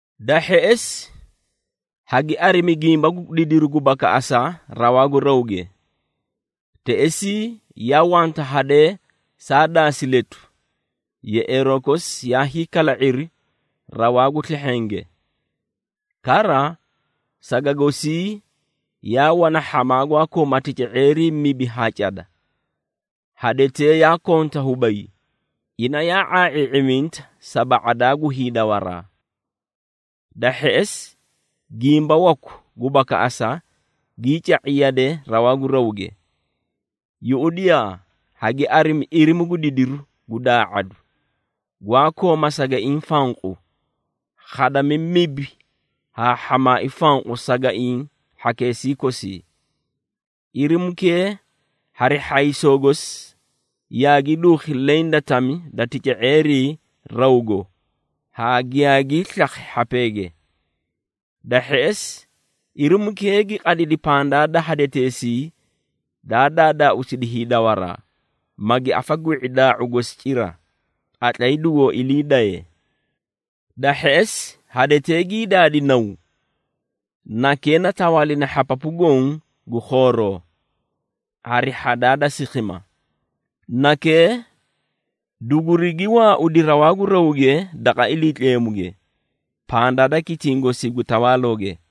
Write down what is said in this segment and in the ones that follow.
Da hheꞌesi, hagi arimi gimba gu didiru gu bakaꞌasa rawaa gu rawge. Teꞌesii yaa wanta hadee saa daasi letu, yeꞌeeroo kosi yaa hiikala⁄iri rawaa gu slehhenge. Kara saga gosii yaa wana hhamaa gwaa koomaa tica⁄eerii mibi haa cada. Hadetee yaa konta hubay, ina yaa ⁄aa⁄ii⁄iminta sa ba⁄adaa gu hiidawaraa. Da hheꞌesi, gimba waku gu bakaꞌasa gii ca⁄i yade rawaa gu rawge. Yuꞌudiyaa, hagi arimi irimu gu didiru gu daa⁄adu, gwaa kooma sagaiĩ fanqu, khadami mibi haa hhamaai fanqu sagaiĩ hhakeesii kosii. Irimukee hari hhaysoo gosi yaagi duukhi leẽ da tami da tica⁄eerii rawgo haa giyaagii slakhi hhapeege. Da hheꞌesi, irimukee gi qadidi pandaa da hadeteesii daa daadaauusidi hiidawaraa, magi afa gwi⁄i daa⁄u gosi cira, qatlay dugoó ilii daye. Da hheꞌesi, hadetee gii daadi naw. Nakee na tawaalina hhapapu goõ gu khooroo, hari hhadaa da sikhima. Nakee dugurigi waaudi rawaa gu rawge daqa Iliitleemuge, pandaa da kitiĩ gosii gu tawaalooge.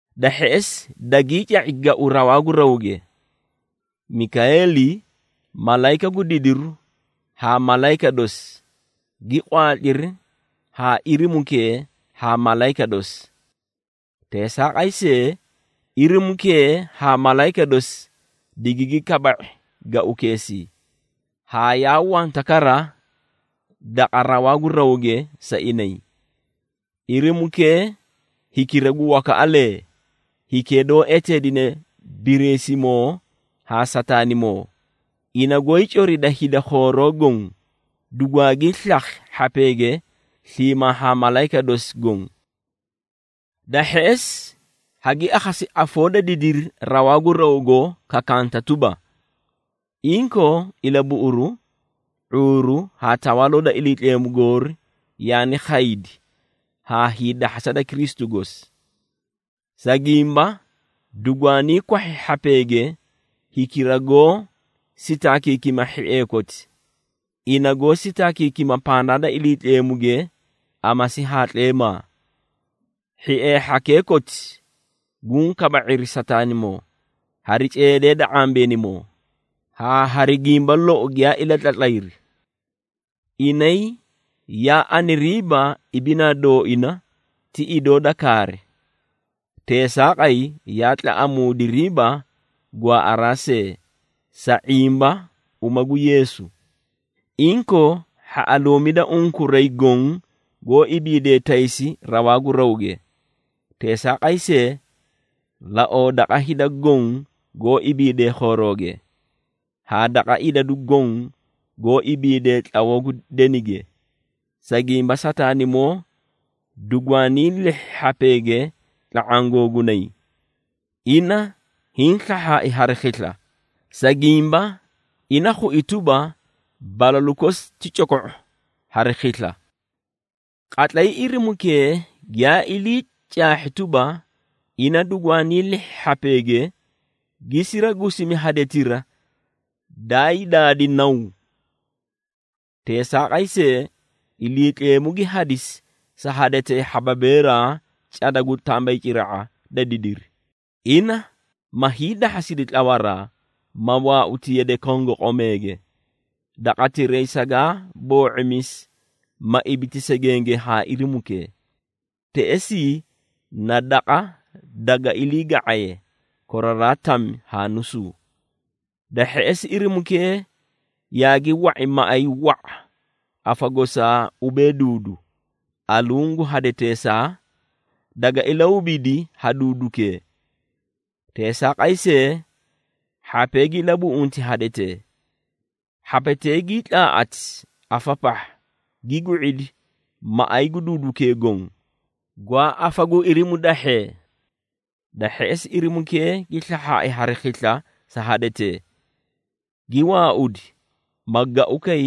Da hheꞌesi, dagii ca⁄i gau rawaa gu rawge. Mikayeeli, malayika gu didiru haa malayika dosi, gi qwaatliri haa irimukee haa malayika dosi. Teesaaqay see, Irimukee haa malayika dosi digigi kaba⁄i gaukeesii, haa yaa wanta kara daqa rawaa gu rawge sa inay. Irimukee, hikira gu wakaꞌalee, hikee doó eteedine Biriisimoo haa Sataanimoo, ina goóyii corida hida khooroo goõ, dugwaagii slakhi hhapeege sliimaa haa malayika dosi goõ. Da hheꞌesi, hagi akhasi afoo da didiri rawaa gu rawgo kakanta tuba, “Inkoo ilabuꞌuru, ⁄uuru haa Tawaaloo da Iliitleemu goori yaani khaydi haa hiidahhasa da Kristu gosi. Sa gimba, dugwaanii kwahhi hhapeege hikira goó sitaakiikima hhiee koti, ina goó sitaakiikima pandaa da Iliitleemuge amasi haa tleemaa. Hhiee hhakee koti guũ kaba⁄iri Sataanimoo, hari ceedee da ⁄ambeenimoo, haa hari gimba lou giyaa ilatlatlayri. Inay yaa aniriiba ibinaa dooina ti idoo da kaari, teesaaqay yaa tlaꞌamuudiriiba gwaaꞌaraa see, sa ⁄imba uma gu Yeesu. Inkoo, hhaꞌaluumida unkuray goõ goó ibiidee taysi rawaa gu rawge! Teesaaqay see, laoo daqa hida goõ goó ibiidee khoorooge, haa daqa idadu goõ goó ibiidee tlawoo gu denige, sa gimba Sataanimoo dugwaanii lihhi hhapeege tla⁄aã googunay. Ina hiĩ slahhaai hari khisla, sa gimba ina khui tuba, balalu kosi ti coko⁄o hari khisla!” Qatlay irimukee giyaa ili caahhi tuba, ina dugwaanii lihhi hhapeege, gi siragusimi hadetira daay daadi naw. Teesaaqay see, Iliitleemu gi hadisi sa hadetee hhababeeraa cada gu tambayciraꞌa da didiri, ina ma hiidahhasidi tlawaraa, ma waauti yade kongoqomeege, daqatiray sagaa boo⁄imisi, ma ibiti segenge haa irimukee. Teꞌesii na daqa daga ilii ga⁄aye, koraraa tami haa nusuu. Da hheꞌesi, irimukee yaagi wa⁄i maꞌay wa⁄a afa gosaa ubee duudu, aluũ gu hadeteesaa, daga ilahubidi ha duudukee. Teesaaqay see, hhapee gi ilabuꞌunti hadetee. Hhapetee gii tlaaꞌati afa pahha, gi gwi⁄idi maꞌay gu duudukee goõ, gwaa afa gu irimu dahhee. Da hheꞌesi, irimukee gi slahhaai hari khisla sa hadetee. Gi waaudi, ma gaukay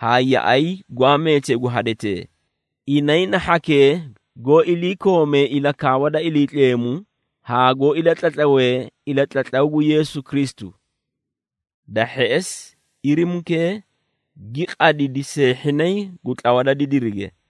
haa yaꞌay gwaa meetee gu hadetee, inay na hhakee goó iliikoomee ilakaawa da Iliitleemu haa goó ilatlatlawee ilatlatlaw gu Yeesu Kristu. Da hheꞌesi, irimukee gi qadidi seehhinay gu tlawa da didirige.